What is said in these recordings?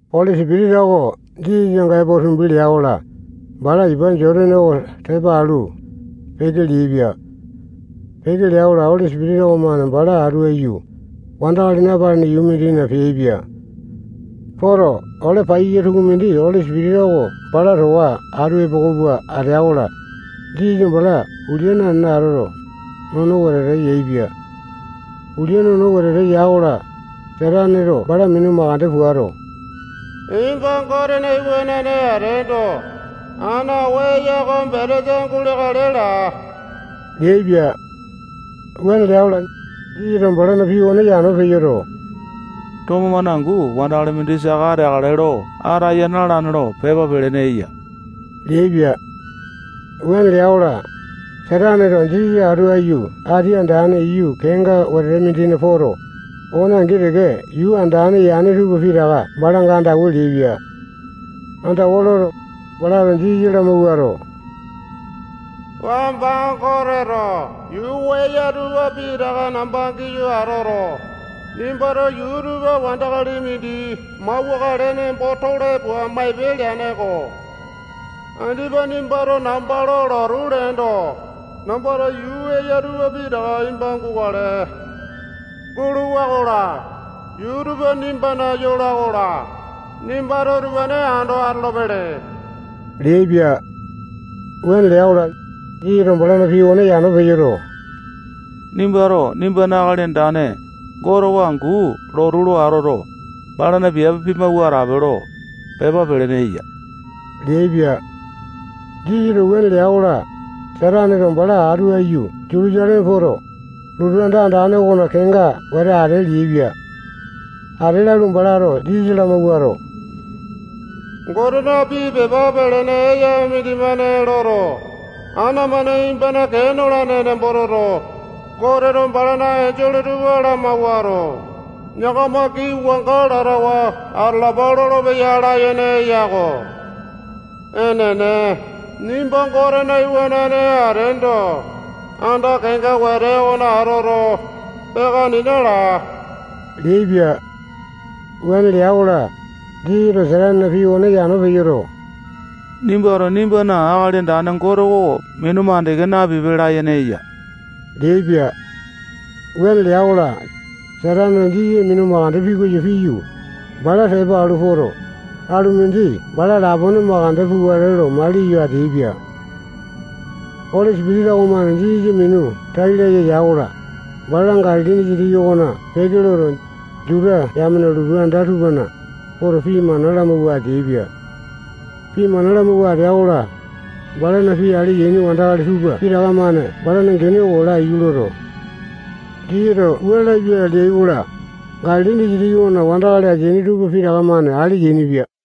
Oli Sipitisa oko Jisasanga epo tumbi lea-kola, bala ipa Jotane oko tepa alu, peke leaipia. Peke lea-kola, Oli Sipitisa okomane bala atu aiyu, wandakali napalene yuu mindina peaipia. Poto, ole paiyasa tukumindi Oli Sipitisa oko bala towa atu epoko pua atea-kola, Jisasa bala ulia nanene atoto, nono wetete yaepia. Ulia nono wetete ya-kola, Sataneto bala minu mandeke puato, nimba Gote iwanane ateendo, ana oo eya oko betesa guleakale laa leaipia. Wuane lea-kola, Jisasato balana pii okone yano peyoto, tomo-mane angu wandakali mindi saka ateakale lo ataya na-alane lo pepa pelene eya leaipia. Wuane lea-kola, Sataneto Jisasa atu aiyu ati andane iyu kenga wete mindina poto, okone angi teke yuu andane yane tupa pitaka balanga andawa leaipia. Andawa loto, balato Jisasa lamawuato, wamba Goteto yuu eya tupa pitaka namba giyu atoto, nimbato yuu utupa wandakali mindi mauwakale nembo tole pua maipe leane-ko. Andipa nimbato namba lo lotu leendo, nambato yuu eya utupane pitaka nimba gukale. Guluwa-kola, yuu utupa nimbana yola-kola, nimbato utupane ando atolopele leaipia. Wuane lea-kola, Jisasato balana pii okone yano peyoto, nimbato nimbana Akali Andane Gote oko angu lotu lo atoto, balana piape pimawua atape lo, pepa pelene eya leaipia. Jisasato wuane lea-kola, Sataneto bala atu aiyu Jutusaleme poto, lotu anda andane okona kenga wete ate leaipia. Ate lalu, balato Jisasa lamawuato, Gotena pii pepa pelene eya mindimane loto, ana-mane nimbana kee nolane nembo toto, Goteto balana enjole tupa lamawuato, yakama kii wanga latawa atalapa lolopeya layene eya-ko. Enene, nimba Gotena Iwanane ateendo, anda kenga wete okona atoto, peaka nena laa leaipia. Wuane lea-kola, Jisasato Satanena pii okone yano peyoto, nimbato nimbana Akali Andane Gote oko minu mandeke napipe layene eya leaipia. Wuane lea-kola, Sataneto Jisasa minu mandeke pikoyo piyu, bala tepa alu poto, alu mindi bala lapone mandeke pukale lo maliyo ateaipia. Oli Sipitisa okomane Jisasa minu tai laya ya-kola, bala Galili disitiki okona peke loto, Juta yamena lotu anda tupana poto, pii mana lamawua ateaipia. Pii mana lamawua atea-kola, balana pii ale yaini wandakali tupa pitaka-mane balana gene oko laiyu loto, Jisasato wua lapia leai-kola, Galili disitiki okona wandakali ateaini tupa pitaka-mane ale yainipia.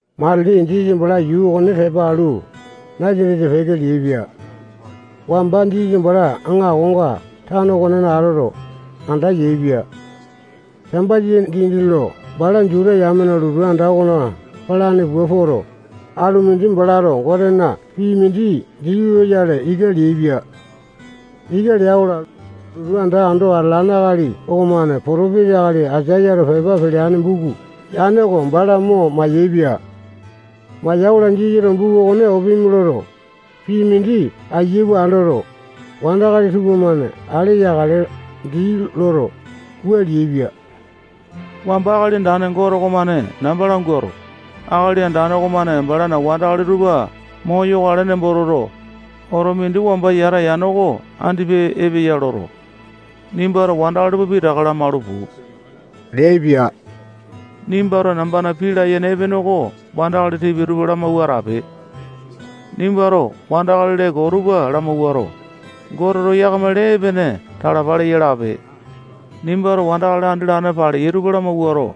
Matili Jisasa bala yuu okone tepa alu, Nasatesa peke leaipia. Wamba Jisasa bala aŋakonga tano okonena atoto, anda yaepia. Sambasa dindi lo bala Juta yamena lotu anda okona palane pua poto, alu mindi balato Gotena pii mindi dii loyale ika leaipia. Ika lea-kola, lotu anda ando atalane akali okomane potopesa akali Aisayato pepa peleane buku yane oko bala mo mayaepia. Maya-kola, Jisasato buku okone opimi loto, pii mindi ayia pua andoto, wandakali tupamane ale yakale dii loto, wua leaipia: Wamba Akali Andane Gote okomane namba languato, Akali Andane okomane balana wandakali tupa moyokale nembo toto, oto mindi wamba yata yane oko andipa epeya loto, nimbato wandakali tupa pitaka lamalu puu leaipia. Nimbato nambana pii layene epene oko wandakali tipia tupa lamawua atape. Nimbato wandakali lee koo tupa lamawuato, Goteto yakamana lee epene talapa leya lape. Nimbato wandakali andi latane paleyai tupa lamawuato,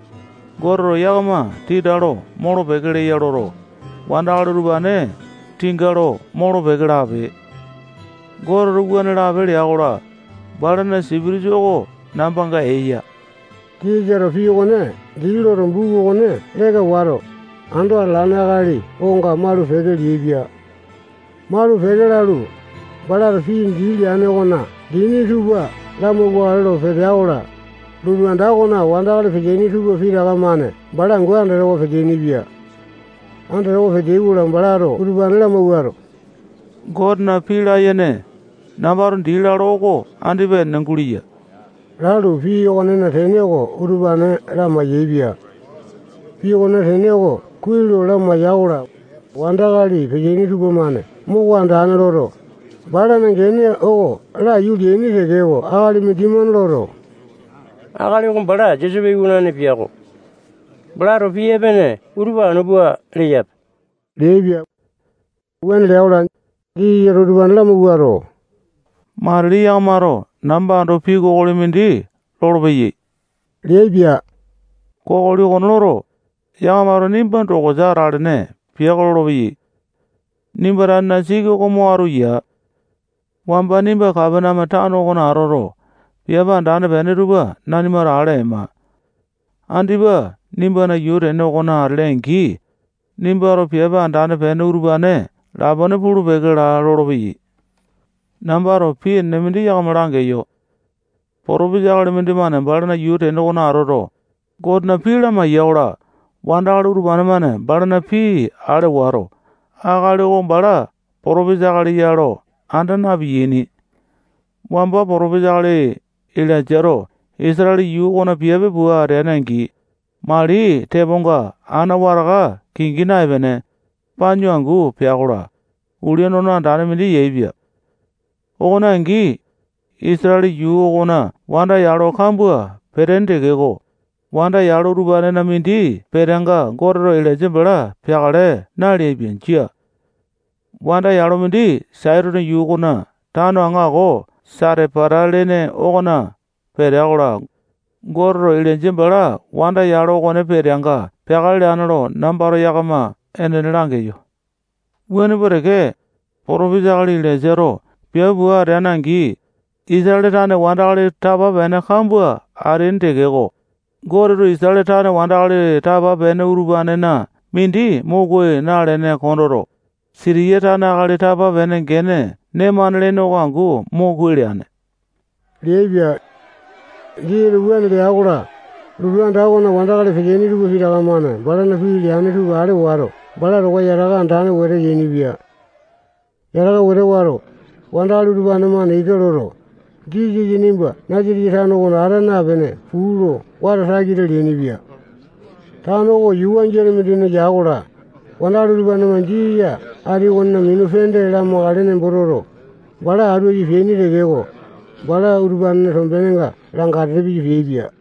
Goteto yakama tinga lo molo-peke leya loto, wandakali utupane tinga lo molo-peke lape. Goteto wuane lape lea-kola, balana Sipitisa oko nambanga eya. Jisasato pii okone dii loto, buku okone leka wato, ando atalane akali okonga malu-peke leaipia. Malu-peke lalu, balato pii dii leane okona dini tupa lamauwakale lo petea-kola, lotu anda okona wandakali peteaini tupa pitaka-mane bala angu andatawa peteaini-pia. Andatawa peteai-kola, balato utupane lamawuato, Gotena pii layene, nambato dii lalo oko andipa enene guleya lalu, pii okonena tene oko utupane lamai-yaepia. Pii okonena tene oko kuai lo lamaiya-kola, wandakali peteaini tupamane moko andane loto, balana gene oko laiyu leaini tekeko, akali mindimane loto, akali oko bala Josepe iwanane piako. Balato pii epene utupa anu pua leyape leaipia. Wuane lea-kola, Jisasato utupane lamawuato, matili yakamato namba ando pii kokoli mindi lolopeyai leaipia. Kokoli okone loto, yakamato nimba dokosa atalene piako lolopeyai. Nimba tanena siki oko mo atu yaa. Wamba nimba Kapaneame tano okona atoto, piape andane peene tupa nanimato ale aima. Andipa nimbana yuu tene okona atele-angi, nimbato piape andane peene utupane lapone pulu-peke laa lolopeyai. Nambato pii enene mindi yakama langeyo. Potopesa akali mindimane balana yuu tene okona atoto, Gotena pii lamaiya-kola, wandakali utupane-mane balana pii ale wato, akali oko bala potopisa akali ya lo anda na-piyaini. Wamba potopesa akali Ilainjato Isatale yuu okona piape pua ateane-angi, mali teponga ana wataka kingi naepene, panyu angu pea-kola, ulia nono andane mindi yaepia. Okone angi, Isatale yuu okona wanda yalo kambua peteaini tekeko, wanda yalo utupanena mindi peteanga Goteto Ilainja bala peakale naleaipia. Jia. Wanda yalo mindi Saitone yuu okona tano aŋako Satepata lene okona petea-kola, Goteto Ilainja bala wanda yalo okone peteanga peakale leane lo nambato yakama enene langeyo. Wuane pua teke, potopesa akali Ilaisato piape pua ateane-angi, Isatale tane wandakali tapa-pene kambua ateaini tekeko, Goteto Isatale tane wandakali tapa-pene utupanena mindi mo kuai nalene kondoto, Sitiya tane akali tapa-pene gene Nemane lene oko angu mo kuai leane leaipia. Jisasato wuane lea-kola, lotu anda okona wandakali peteaini tupa pitaka-mane balana pii leane tupa ale wato, bala towa yataka andane wete yainipia. Yataka wete wato, wandakali utupane-mane ika loto, Jisasa nimba Nasatesa tano okona ata napene puu lo wata takita leainipia. Tano oko yuu wangiane mindina ya-kola, wandakali utupane-mane Jisasa ati okonena minu pende lamakale nembo toto, bala atu aiyu peaini tekeko, bala utupanena tombenenga langatete piyu peaipia.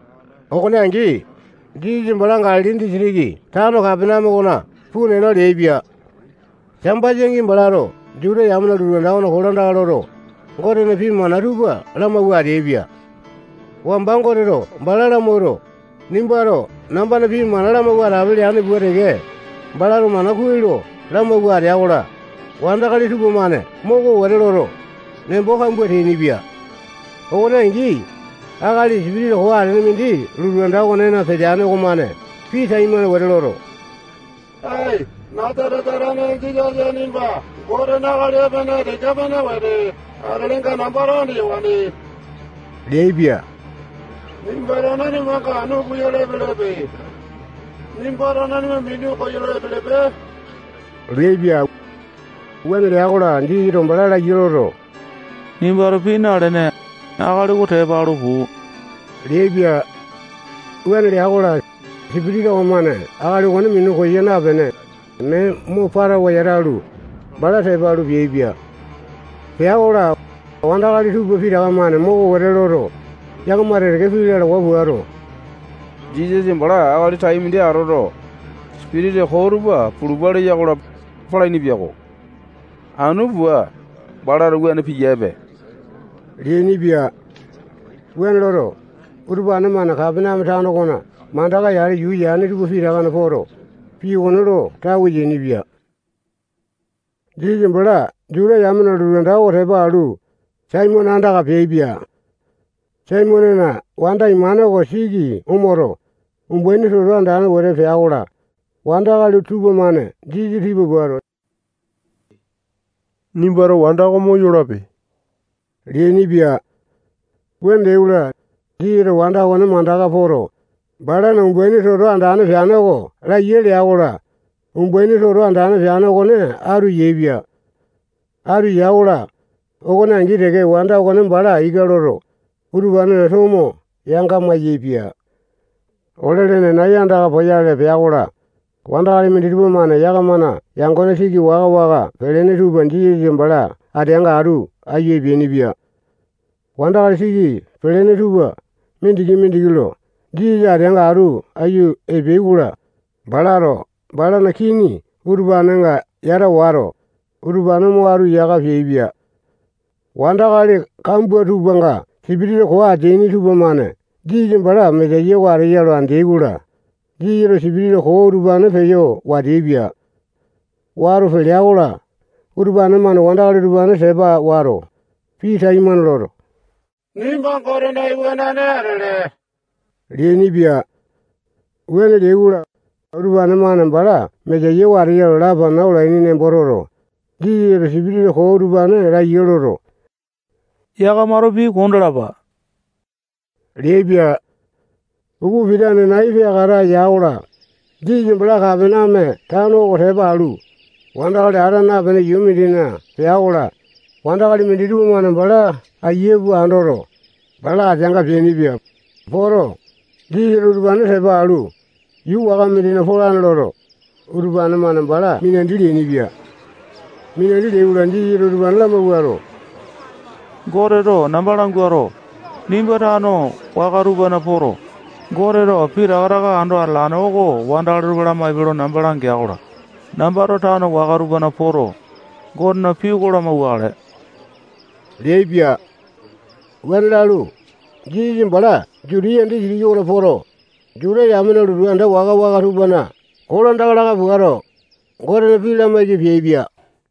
Okone angi, Jisasa bala Galili disitiki tano Kapaneame okona puu nena leaipia. Sambasa-angi, balato Juta yamena lotu anda okona kolandaka loto, Gotena pii mana tupa lamawua ateaipia. Wamba Goteto bala lamawuato, nimbato nambana pii mana lamawua atape leane pua teke, balato mana kuai lo lamawua atea-kola, wandakali tupamane moko wete loto, nembo kambua teainipia. Okone angi, akali sipitisa koo atene mindi lotu anda okonena peteane okomane pii taimane wete loto, ae, Nasatesa tane Jisasa nimba Gotena akali epene tika-pene wete atelenga nambato andeyawane leaipia. Nimbato nanimanga anu puyale epelepe. Nimbato nanima minu koyolo epelepe leaipia. Wuane lea-kola, Jisasato bala laiya loto, nimbato pii nalene, akali oko tepa alu puu leaipia. Wuane lea-kola, sipitisa koo okomane akali okone minu koya napene, mee mo patawa yatalu, bala tepa alu, peaipia. Pea-kola, wandakali tupa pitaka-mane moko wete loto, yakama teke-teke pii lalawa puato, Jisasa bala akali tai mindi atoto, sipitisa koo tupa pulupa leya-kola, palaini yako. Anu pua, balato wuane piyape leainipia. Wuane loto, utupane-mane Kapaneame tano okona mandaka-yale yuu yane tupa pitakana poto, pii okone lo tawe yainipia. Jisasa bala Juta yamena lotu anda oko tepa alu, Saimone andaka peaipia. Saimonena wanda imane oko siki omoto, umbaini toto andane wete pea-kola, wandakali tupamane Jisasa tipa puato, nimbato wanda oko moyolape leainipia. Wuane leai-kola, Jisasato wanda okone mandaka poto, balana umbaini toto andane peane oko laiya lea-kola, umbaini toto andane peane okone atu yaepia. Atu ya-kola, okone angi teke wanda okone bala ika loto, utupanena tomo yanga mayaepia. Ole lene nai andaka poyale pea-kola, wandakali minditupa-mane yakamana yangone siki waka-waka pelene tupa Jisasa bala ateanga atu aiyu epeainipia. Wandakali siki pelene tupa mindiki-mindiki lo Jisasa ateanga atu aiyu epeai-kola, balato balana kini utupanenga yata wato, utupane mo atu yaka peaipia. Wandakali kambua tupanga sipitisa koo ateaini tupamane Jisasa bala Mesaya oko ateya lo andeai-kola, Jisasato sipitisa koo utupane peyo wateapia. Wato pelea-kola, utupane-mane wandakali utupane tepa wato, pii taimane loto, nimba Gotena iwanane atele leainipia. Wuane leai-kola, utupane-mane bala Mesaya oko ateya lo lapana olaini nembo toto, Jisasato sipitisa koo utupane laiya loto, yakamato pii kondalapa leaipia. Upa pitane nai peakata ya-kola, Jisasa bala Kapaneame tano oko tepa alu, wandakali ata napene yuu mindina pea-kola, wandakali minditupa-mane bala ayia pua andoto, bala ateanga peainipia. Poto, Jisasato utupane tepa alu, yuu waka mindina polane loto, utupane-mane bala minandi leainipia. Minandi leai-kola, Jisasato utupane lamawuato, Goteto namba languato, nimba tano waka tupana poto, Goteto pitaka taka ando atalane oko wandakali tupa lamaipe lo namba langea-kola, nambato tano waka tupana poto, Gotena pii oko lamauwakale leaipia. Wuane lalu, Jisasa bala Jutiya disitiki okona poto, Juta yamena lotu anda waka-waka tupana kolandaka laka puato, Gotena pii lamaiki peaipia.